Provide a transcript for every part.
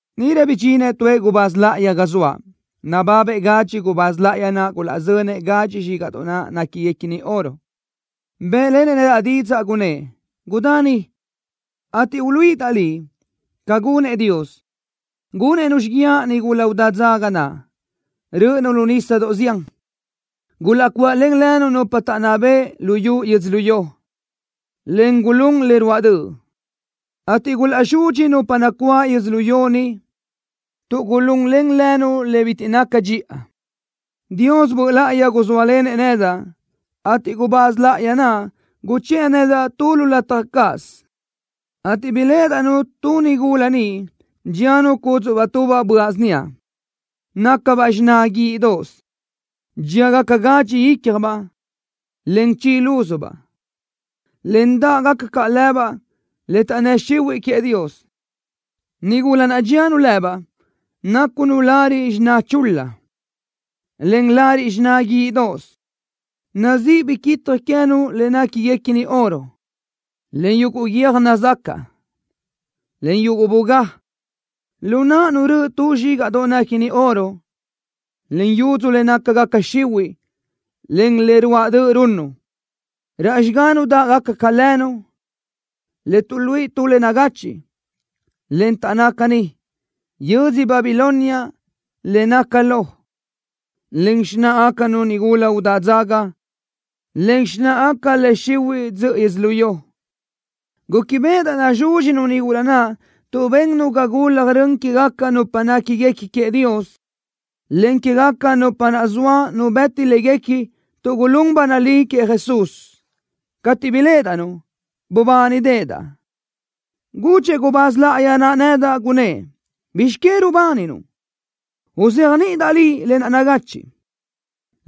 Níʼirö bidxinëʼ tuëʼ gubáz láʼayi ga zoaʼ, nababëʼ gadxi gubáz láʼayi naʼ gulaʼzönëʼ gadxi zxígaʼdoʼ naʼ néquiguequini oro. Bë́ʼlenëʼ nedaʼ didzaʼ, gunnë́ʼ: “Gudá ni, ateʼ uluíʼidaʼ liʼ ca gunëʼ Dios, gunëʼ-nu xíguiaʼ nigula udá dzaga naʼ, rö́ʼönu lu nísadoʼ zián. Gulaʼcuaʼlen lënu nupa taʼnná bëʼ luyú yödzölió, en gulún le ruáʼ döʼ, ateʼ gulaʼzudxi nupa nacuáʼ yödzölió ni, tuʼ gulunlen lënu le bitiʼ naca dxiʼa.” Dios Böʼ Láʼayi guzóalenëʼ nedaʼ, ateʼ gubáz láʼayi naʼ guchë́ʼë nedaʼ tu lu lataj cáʼasö, ateʼ biléʼedaʼ-nu tu nigula niʼ dxíanu cúdzuʼbaʼ tubaʼ böaʼ síniaʼ, nácabaʼ xiná guíʼidoʼos. Dxíagaca gadxi ícjabaʼ, en chi lúzubaʼ, en dáʼgaca caʼ lëbaʼ le taʼnnë́ xihuiʼ queëʼ Dios. Nigula naʼ dxíanu lëbaʼ nácunu lariʼ xiná chul-la, en lariʼ xiná guíʼidoʼos. Nazíʼi biquitaj queë́nu le néquiguequini oro, en yuguʼ guiö́j nazacaʼ, en yuguʼ bugá. Lu náʼanu röʼö tu zxígaʼdoʼ néquini oro, en yudzu le nácagaca xihuiʼ, en le ruáʼ döʼ runnu. Raʼ xigánu dáʼgaca ca lënu, le tuʼluíʼi tu le nagachiʼ, en taʼnná caní: “Yödzö Babilonia Le Naca Lo”, en “Xináʼagacanu Nigula Udá Dzaga”, en “Xináʼagaca Le Xihuiʼ Dzöʼö Yödzölió.” Gúquibeʼedaʼ nazúdxinu nigula naʼ tuʼ bennu ga gulaj rön quégaca nupa néquiguequi queëʼ Dios, en quégaca nupa naʼ zoa nu bëti léguequi tuʼ gulún ba nalí queëʼ Jesús. Cateʼ biléʼedaʼ-nu, bubánideʼedaʼ. Gudxëʼ gubáz láʼayi naʼ nedaʼ, gunnë́ʼ: “¿Bizx que rubáninuʼ? Uzéajniʼidaʼ liʼ lë naʼ nagachiʼ,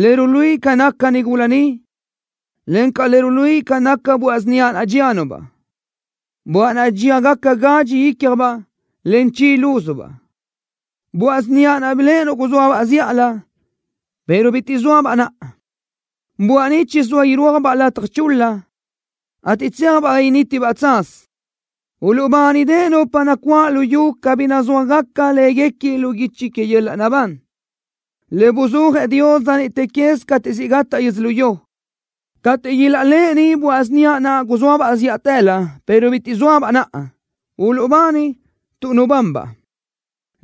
le ruluíʼi ca naca nigula ni, encaʼ le ruluíʼi ca naca böaʼ síniaʼ naʼ dxíanu-baʼ, böaʼ naʼ dxíagaca gadxi ícjabaʼ, en chi lúzubaʼ. Böaʼ síniaʼ naʼ biléʼenuʼ guzóabaʼ zíʼalö, pero bitiʼ zóabaʼ naʼa. Böaʼ ni chizóa irúajbaʼ lataj chul-la, ateʼ tséajbaʼ ga nítibaʼ tsaz. Uluʼbánideʼe nupa nacuáʼ luyú cabí nazúajgaca láguequi lu guichi que yöl-laʼ naʼbán, le buzúajëʼ Dios dza niʼte quez cateʼ siʼ gataʼ yödzölió. Cateʼ ilaʼléʼeni böaʼ síniaʼ naʼ guzóabaʼ zíʼatëlö, pero bitiʼ zóabaʼ naʼa, uluʼbani tuʼ nubanbaʼ.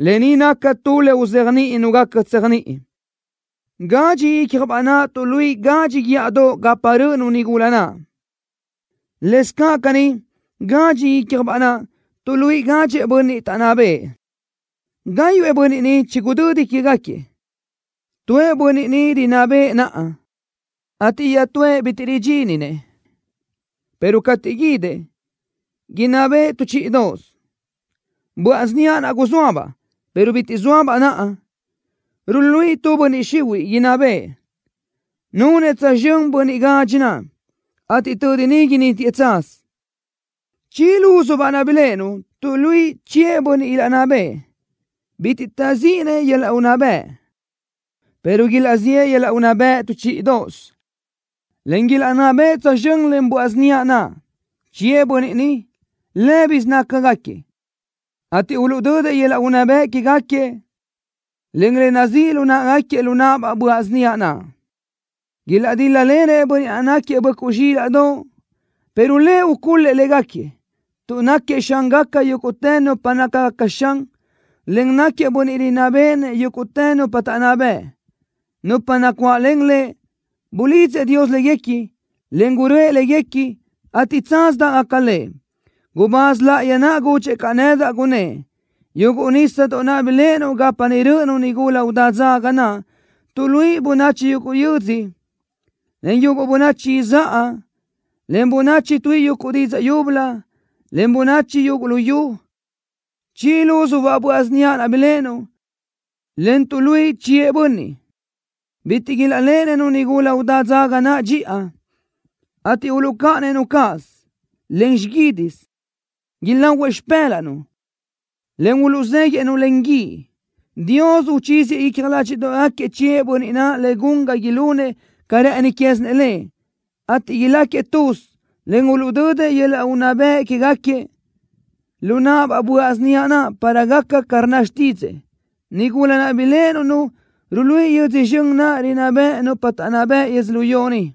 ’Lë ni naca tu le uzéajniʼi nu gaca tséajniʼi: Gadxi ícjabaʼ naʼ tuʼluíʼi gadxi guíʼadoʼ gapa rö́ʼönu nigula naʼ. Lëscaʼ caní gadxi ícjabaʼ naʼ tuʼluíʼi gadxëʼ bönniʼ taʼnná bëʼë. Gáyuʼë bönniʼ ni chigudödi quégaquiëʼ. Tuëʼ bönniʼ ni rinná bëʼë naʼa, ateʼ iaʼtúëʼ bitiʼ ridxíninëʼ, pero cateʼ guídëʼ, inná bëʼë tu chíʼidoʼosö. Böaʼ síniaʼ naʼ guzóabaʼ, pero bitiʼ zóabaʼ naʼa, ruluíʼi tu bönniʼ izxunuʼ, inná bëʼë. Nunëʼ tsözxö́n bönniʼ gadxi naʼ, ateʼ tödi ni nítiëʼ tsaz. ’Chi lúzubaʼ naʼ biléʼenuʼ tuʼluíʼi chiëʼ bönniʼ ilaʼnná bëʼë. Bitiʼ taʼzíʼininëʼ yöl-laʼ unná bëʼ, pero ilaʼziʼë yöl-laʼ unná bëʼ tu chíʼidoʼosö, en ilaʼnná bëʼë tsözxö́n len böaʼ síniaʼ naʼ. Chiëʼ bönniʼ ni, lë́bisö nácagaquiëʼ, ateʼ uluʼdödëʼ yöl-laʼ unná bëʼ quégaquiëʼ, en le nazíʼ lu náʼagaquiëʼ lu náʼabaʼ böaʼ síniaʼ naʼ. Ilaʼdíl-lalenëʼ Bönniʼ naʼ náquiëʼ Böʼcuʼ Zxílaʼdoʼ, pero Lëʼ ucul-lëʼ légaquiëʼ, tuʼ náquiëʼ Xángaca yúguʼtë nupa nácagaca xan, en náquiëʼ Bönniʼ rinná béʼenëʼ yúguʼtë nupa taʼnná bëʼ. Nupa nacuáʼlen Lëʼ, bulidzëʼ Dios léguequi, en gurö́ëʼ léguequi, ateʼ tsaz dáʼgaca Lëʼ.” Gubáz láʼayi naʼ gudxëʼ caʼ nedaʼ, gunnë́ʼ: “Yuguʼ nísadoʼ naʼ biléʼenuʼ gapa niʼ rö́ʼönu nigula udá dzaga naʼ, tuʼluíʼi bönachi yuguʼ yödzö, en yuguʼ bönachi izáʼa, en bönachi tuíʼi yuguʼ didzaʼ yúbölö, en bönachi yuguʼ luyú. Chi lúzubaʼ böaʼ síniaʼ naʼ biléʼenuʼ, en tuʼluíʼi chiëʼ bönniʼ, bitiʼ ilaʼléʼenëʼ-nu nigula udá dzaga naʼ dxiʼa, ateʼ uluʼcáʼanëʼ-nu cáʼasö, en xiguídisö. Ilahuëʼ xipë́laʼnu, en uluʼzéguiʼë-nu len guíʼ. Dios uchíziëʼ icja ládxiʼdoʼgaquiëʼ chiëʼ bönniʼ naʼ le gun ga ilunëʼ ca rë́ʼëni quézinëʼ Lëʼ, ateʼ ilácagaquiëʼ tuz, en uluʼdödëʼ yöl-laʼ unná bëʼ quégaquiëʼ lu náʼabaʼ böaʼ síniaʼ naʼ para gaca ca rnna xtídzëʼë. Nigula naʼ biléʼenuʼ-nu ruluíʼi yödzö zxön naʼ rinná beʼe nupa taʼnná bëʼ yödzölió ni.”